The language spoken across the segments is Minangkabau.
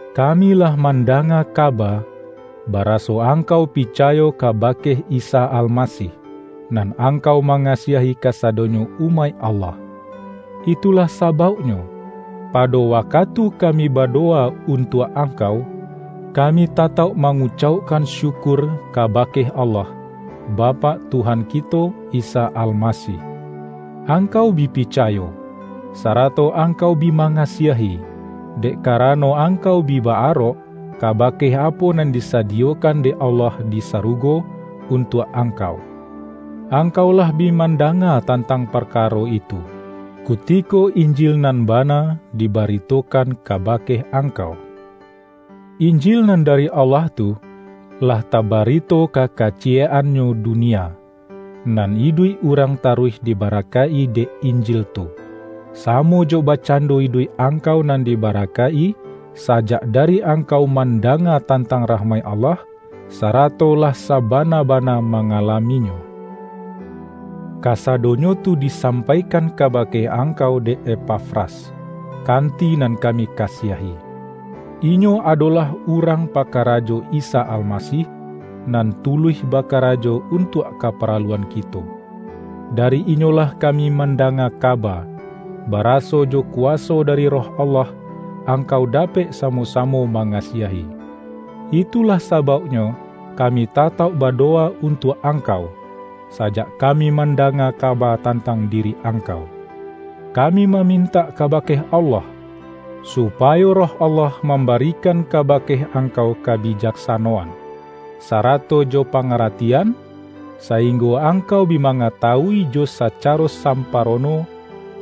Kami lah mandanga kaba, bara-so angkau picayo kabake Isa Almasih, nan angkau mangasiahi kasadonyo umaik Allah. Itulah sabauknyo, pa-do wakatu kami badowa untuak ang-kau, kami tatauk mangucaukkan syu-kur kabake Allah, Bapak Tuhan kito Isa Almasih. Angkau bi picayo, sara-to angkau bi mangasiahi, dek karano angkau bi ba-arok, kabake apo nan disadiyokan dek Allah di sarugo un-tuak angkau. Angkau lah bi manda-nga tantang parkaro itu, kutiko Injil nan bana dibaritokan kabake angkau. Injil nan dari Allah tu, lah tabari-to ka kaciyek-annyo dunia, nan iduik urang taruih dibarakaik-i dek Injil tu, samo jo bakcando iduik angkau nan dibarakaik-i, sajak dari angkau man-danga tantang rahmaik Allah, sara-to lah sabana-bana mangalaminyo. Kasadonyo tu disampaikan kabake angkau dek Epafras, kanti nan kami kasiahi. Inyo adolah urang pakarajo Isa Almasih, nan tuluih bakarajo un-tuak kaparaluan kito. Dari inyolah kami mandanga kaba, baraso jo ku-waso dari Roh Allah angkau dapek samo-samo mangasiahi. Itulah sabauknyo kami tatauk ba-dowa untuak angkau, sajak kami man-danga kaba tantang diri angkau. Kami mamintak kabake Allah, supayo Roh Allah mambarikan kabake angkau ka-bijaksanoan, sarato jo pangaratian, sa-inggo angkau bi mangatawui jo sacaro samparono,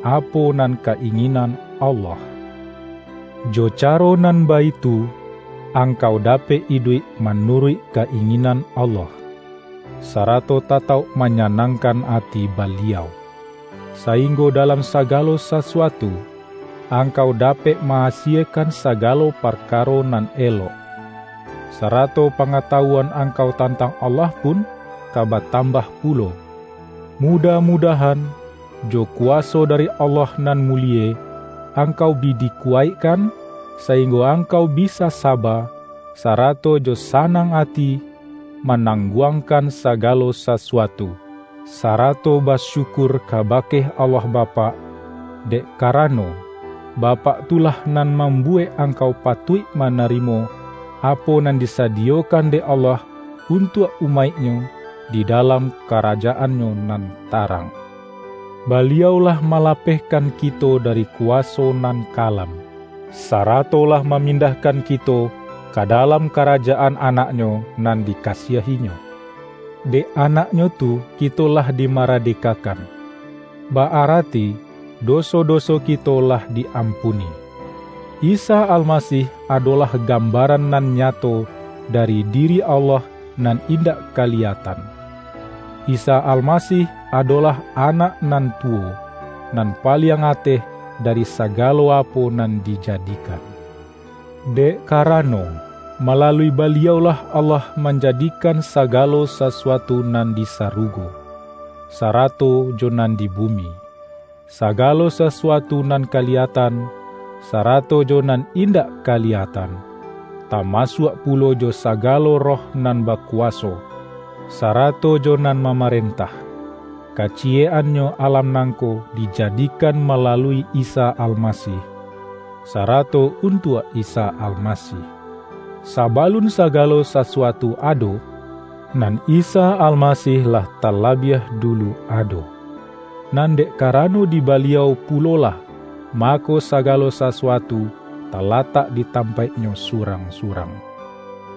apo nan ka-inginan Allah. Jo caro nan baitu, angkau dapek iduik manuruik ka-inginan Allah, sa-rato tatauk manyanangkan ati Baliau, sainggo dalam sagalo sasuatu, ang-kau dapek ma-asiekan sagalo parkaro nan elok. Sarato pangatawuan angkau tantang Allah pun, ka batambah pu-lo. Mudah-mudahan, jo kuwaso dari Allah nan mulie, angkau bi dikuwaik-kan, sainggo angkau bisa saba, sarato jo sanang ati, manangguangkan saga-lo sasuatu, sarato basyukur kabake Allah Bapak. Dek karano, Bapak tu lah nan mambuwek angkau patuik mana-rimo, apo nan disadiyokan dek Allah untuak umaik-Nyo di dalam karajaan-Nyo nan tarang. Baliau lah malapeh-kan kito dari kuwaso nan kalam, sa-rato lah mamindahkan kito ka dalam karajaan Anak-Nyo nan dikasiahi-Nyo. Dek Anak-Nyo tu kito lah dimarade-kakan; ba-arati doso-doso kito lah di-ampuni. Isa Almasih adolah gambaran nan nyato dari diri Allah nan indak kaliyatan; Isa Almasih adolah Anak nan tuwo, nan paliang ateh dari sa-galo apo nan dijadikan. Dek kara-no, malalui Baliau-lah Allah manjadikan sagalo sasuatu nan di sarugo, sarato jo nan di bumi, sagalo sasuatu nan kaliyatan, sarato jo nan indak ka-liyatan, tamasuak pulo jo sagalo roh nan bakuwaso, sarato jo nan mama-rentah. Kaciyek-annyo alam nangko dijadikan malalui Isa Almasih, sara-to untuak Isa Almasih. Sabalun sa-galo sasuatu ado, nan Isa Almasih lah talabiah dulu ado. Nan dek karano di Baliau pulolah, mako sagalo sasuatu talatak di tampaiknyo surang-surang.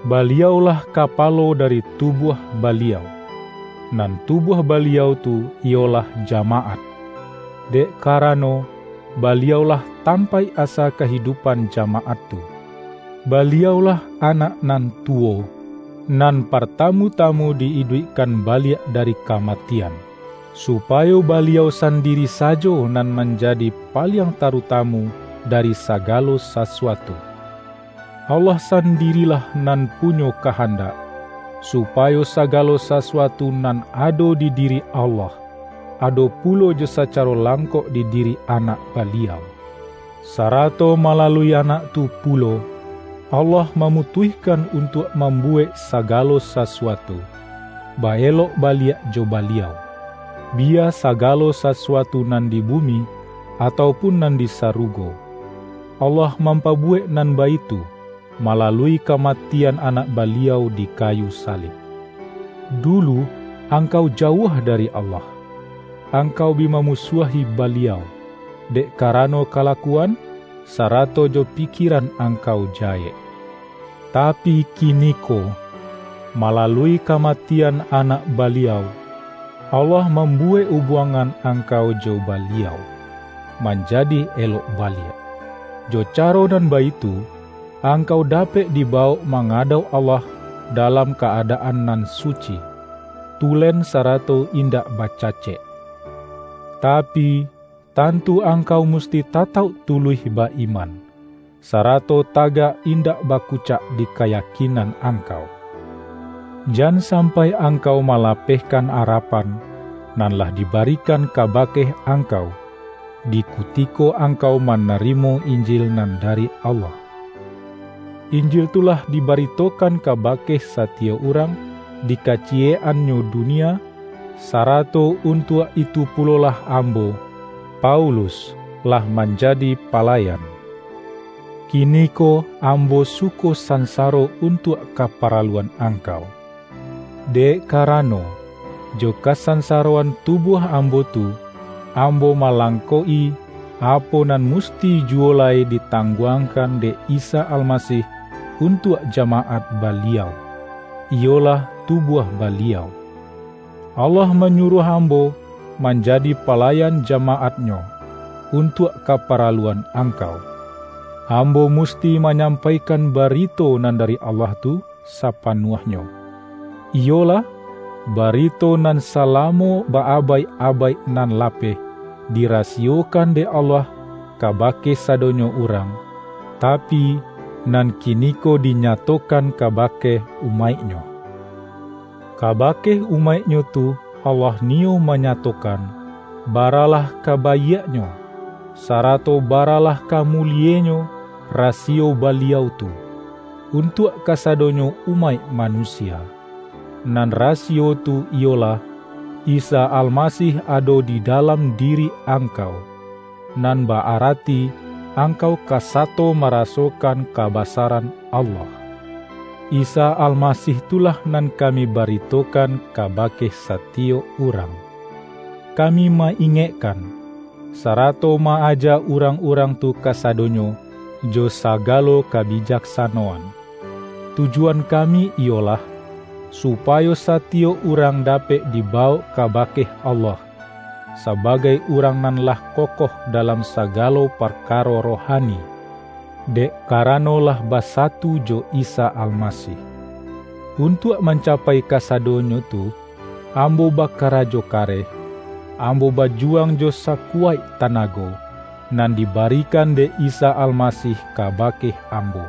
Baliau-lah Kapalo dari tubuah Ba-liau, nan tubuah Baliau tu iyolah ja-maat, dek karano, Baliau-lah tampaik asa kahidupan jamaat tu. Baliau-lah Anak nan tuwo, nan partamu-tamu di-iduikkan baliak dari kamatian, su-payo Baliau sandiri sajo nan manja-di paliang tarutamu dari sagalo sa-suatu. Allah sandirilah nan punyo kahandak, supayo sagalo sasuatu nan ado di diri Allah, ado pulo jo sacaro langkok di diri Anak Baliau. Sara-to malalui Anak tu pulo, Allah ma-mutuihkan untuak mambuwek saga-lo sasuatu, ba-elok baliak jo Baliau — biya sagalo sasuatu nan di bumi, atau pun nan di sarugo. Allah mam-pabuwek nan baitu, malalui kamati-an Anak Baliau di kayu salib. Dulu angkau jauah dari Allah. Angkau bi mamusuahi Baliau, dek karano kalakuan, sarato jo pikieran angkau jahek. Tapi kiniko, ma-lalui kamatian Anak Baliau, Allah mambuwek ubuangan angkau jo Ba-liau, manjadi elok baliak. Jo caro nan baitu, angkau dapek dibawok manga-dauk Allah dalam ka-adaan nan su-ci, tulen sarato indak bacacek. Ta-pi, tantu angkau musti tatauk tuluih ba-iman, sarato tagak indak baku-cak di kayakinan angkau. Jan sam-pai angkau malapehkan arapan, nan lah dibarikan kabake angkau, di ku-tiko angkau manarimo Injil nan da-ri Allah. Injil tu lah dibaritokan kabake satiyok urang di kaciyek-annyo dunia. Sarato untuak itu pulolah am-bo, Paulus, lah manjadi palayan. Kiniko ambo suko sansaro un-tuak kaparaluan angkau. Dek karano, jo kasansaroan tubuah ambo tu, am-bo malangkok-i, apo nan musti juwo lai ditangguangkan dek Isa Almasih untuak jamaat Baliau, iyolah tubuah Baliau. Allah manyuruah ambo manjadi palayan jamaat-Nyo, untuak kaparaluan angkau. Ambo musti ma-nyampaikan barito nan dari Allah tu sapanuahnyo; iyolah, barito nan salamo ba-abaik-abaik nan lapeh, di-rasiyokan dek Allah kabake sadonyo urang, tapi, nan kiniko dinyatokan kabake umaik-Nyo. Kabake umaik-Nyo tu Allah niyo manyatokan, ba-ralah ka baiaknyo, sarato baralah ka mulienyo rasiyo Baliau tu, untuak kasadonyo umaik manusia. Nan ra-siyo tu iyolah: Isa Almasih ado di da-lam diri angkau, nan ba-arati angkau ka sato marasokan kabasaran Allah. Isa Almasih tu lah nan kami ba-ritokan kabake satiyok urang. Kami ma-ingekkan, sarato ma-aja urang-urang tu kasadonyo jo sagalo kabijak-sanoan. Tujuan kami iyolah, supayo satiyok urang dapek dibawok kabake Allah, sabagai urang nan lah kokoh dalam sagalo parkaro rohani, dek ka-rano lah basatu jo Isa Almasih. Un-tuak mancapai kasadonyo tu, ambo bakarajo kareh. Ambo bajuwang jo sakuwaik tanago, nan dibarikan dek Isa Almasih kabake ambo,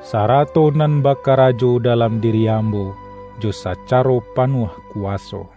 sarato nan bakarajo dalam diri ambo jo sacaro panuah kuwaso.